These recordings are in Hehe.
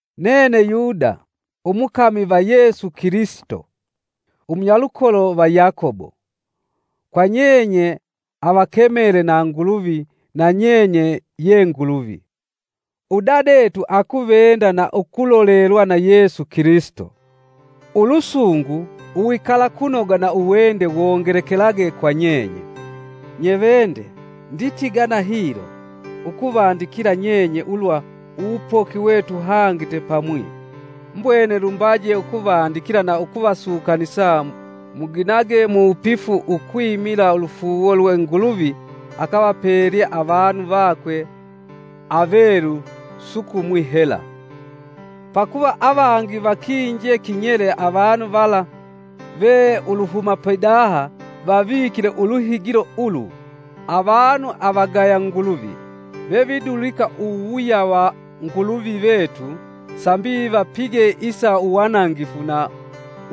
Nene Yuda, umukami va Yesu Kilisito, umunyalukolo va Yakobo, kwa nyenye avakemele na Nguluvi na nyenye ye Nguluvi udadetu akuvenda na ukulolelwa na Yesu Kilisito. Ulusungu, uwikalakunoga na uwende wongelekelage kwa nyenye. Nyevende, nditigana hilo, ukuvandikila nyenye ulwa uwupoki we tuhangite pamwi, mbwene lumbaje ukuvandikila na ukuvasukanisa muginage muwupifu ukwimila ulufuuwo lwe Nguluvi akavapelye avanu vakwe avelu sukumwi hela. Pakuva avangi vakinje kinyele avanu vala ve uluhuma pidaha vavikile uluhigilo ulu, avanu avagaya Nguluvi vevidulika uwuwuya wa Nguluvi vetu sambi vapige isa uwanangifu na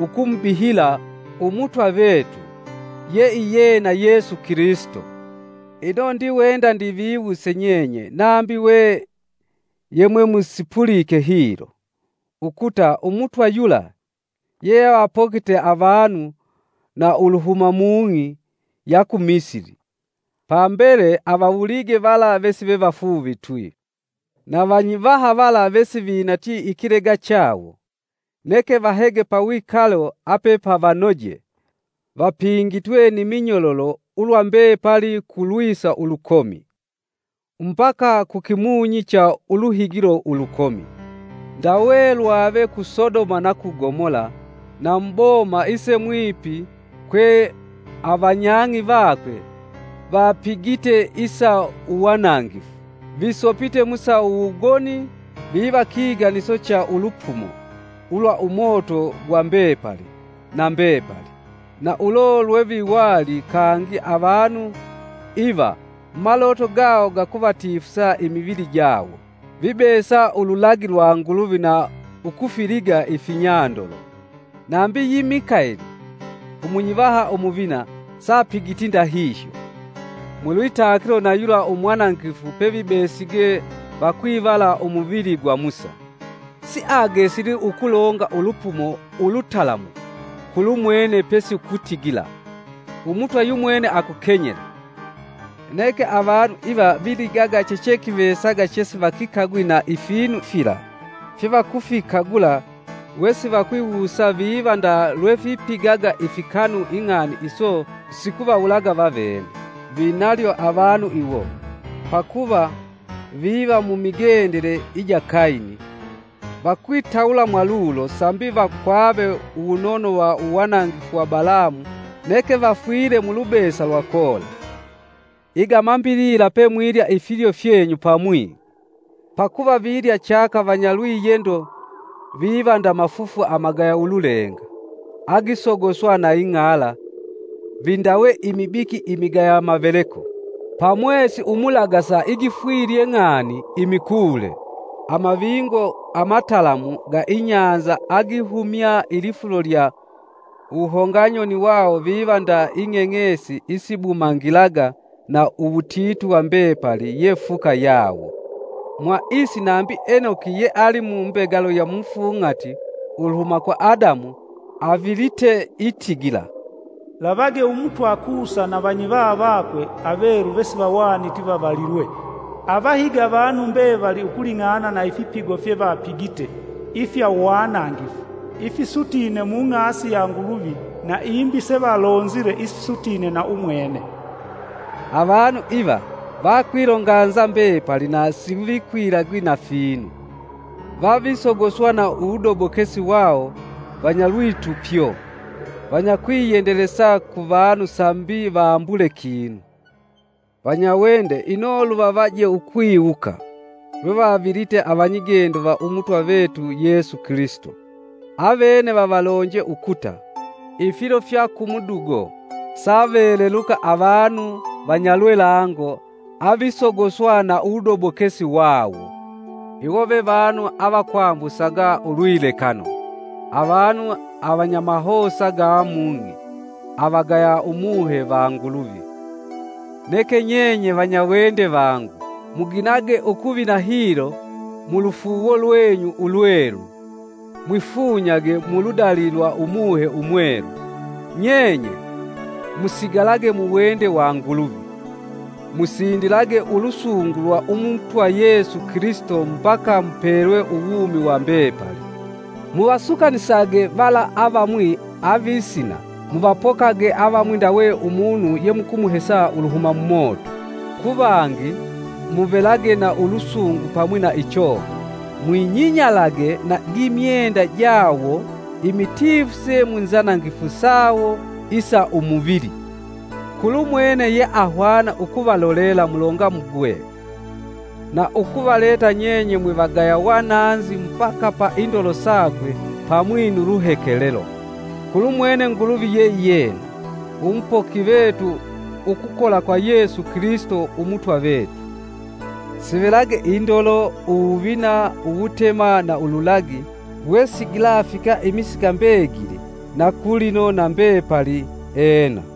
ukumubihila Umutwa vetu, yeiyena Yesu Kilisito. Ino ndiwenda ndiviwuse nyenye nambi we yemwemusipulike hilo, ukuta Umutwa yula yeavapokite avanu na uluhuma mung'i ya ku Misili, pambele avawulige vala vesivevafuuvitwi. Na vanyivaha vala vesivinatyi ikilega chawo, neke vahege pawikalo apepavanoje vapingitwe ni minyololo ulwa mbepali ku lwisa ulukomi, mbaka kukimunyi cha uluhigilo ulukomi, ndawe lwave ku Sodoma na ku Gomola, na mu boma isemwipi kwe avanyang'i vakwe vapigite isa uwanangifu, visopite mu sa uwugoni viva kiganiso cha ulupumo ulwa umoto gwa mbepali na mbepali. Na ulo lweviwali kangi avanu iva mumaloto gawo gakuvatifusa imivili jawo, vibesa ululagi lwa Nguluvi na ukufiliga ifinyandolo. Nambi yi Mikaeli, Umunyivaha Umuvina, sapigiti ndahihyo. Mu lwitakilo na yula umwanangifu pevibesige vakwivala umuvili gwa Musa, siagesili ukulonga ulupumo ulutalamu kulumwene pesi ukutigila, “Umutwa yumwene akukenyele.” Neke avanu iva viligaga chechekivesaga chesivakikagwi na ifinu fila fyevakufikagula wesivakwiwusa viva nda lwefipigaga ifikanu ing'ani iso sikuvawulaga vavene! Vinalyo avanu iwo! Pakuva viva mumigendele ija Kayini, vakwitawula mwalulo sambi vakwave uwunono wa uwanangifu wa Balamu neke vafwile mu lubesa lwa Kola. Iga mambilila pemwilya ifilyo fyenyu pamwi, pakuva vilya chaka vanyalwiyendo; viva nda mafufu amagaya ululenga agisogoswa na ing'ala; vindawe imibiki imigaya maveleko pa mwesi umulagasa igifwilye ng'ani, imikuule; amavingo amatalamu ga inyanza agihumya ilifulo lya wuhonganyoni wawo viva nda ing'eng'esi isibumangilaga na uwutitu wa mbepali ye fuka yawo. Mwa isi nambi Enoki yeali mu mbegalo ya mufung'ati uluhuma kwa Adamu avilite itigila, “Lavage Umutwa aasile na avanyivaha vakwe avelu vesivahwaniti vavalilwe, avahige avanu mbevali ukuling'ana na ifipigo fyevapigite ifya uwanangifu ifisutine mung'asi ya Nguluvi na imbi sevalonzile isisutine na umwene.” Avanu iva vakwilonganza mbepali na sivikwilagi na ifinu; vavisogoswa na uwudobokesi wawo, vanyalwitupyo, vanyakwiyendelesa ku vanu sambi vambule kinu. Vanyawende ino luvavaje ukwiwuka, lwevavilite avanyigendo va Umutwa vetu Yesu Kilisito; Avene vavalonje ukuta, “Ifilo fya kumudugo, saveleluka avanu vanyalwelango avisogoswa na uwudobokesi wao.” Iwo ve vanu avakwambusaga ulwilekano; avanu avanyamahosa ga mung'i avagaya Umuhe va Nguluvi. Neke nyenye, vanyawende vangu, muginage ukuvina hilo mulufuuwo lwenyu ulwelu, mwifunyage muludali lwa Umuhe Umwelu, Nyenye, musigalage muwende wa Nguluvi; musindilage ulusungu lwa Umutwa Yesu Kilisito mbaka mupelwe uwumi wa mbepali. Muvasukanisage vala avamwi avisina; muvapokage avamwi ndawe umunu yemukumuhesa uluhuma mumoto, ku vangi muvelage na ulusungu pamwi na ichoga, mwinyinyalage na gimyenda jawo imitifuse mu nzanangifu sawo isa umuvili. Kulumwene yeahwana ukuvalolela mulongamugwe, na ukuvaleta nyenye mwivagaya wananzi mbaka pa indolo sakwe pamwi nu luhekelelo, kulumwene Nguluvi yeiyena, umupoki vetu ukukola kwa Yesu Kilisito Umutwa vetu, sivelage indolo, uwuvina, uwutema na ululagi, wesigilafika imisika mbegili na kulino na mbepali! Ena.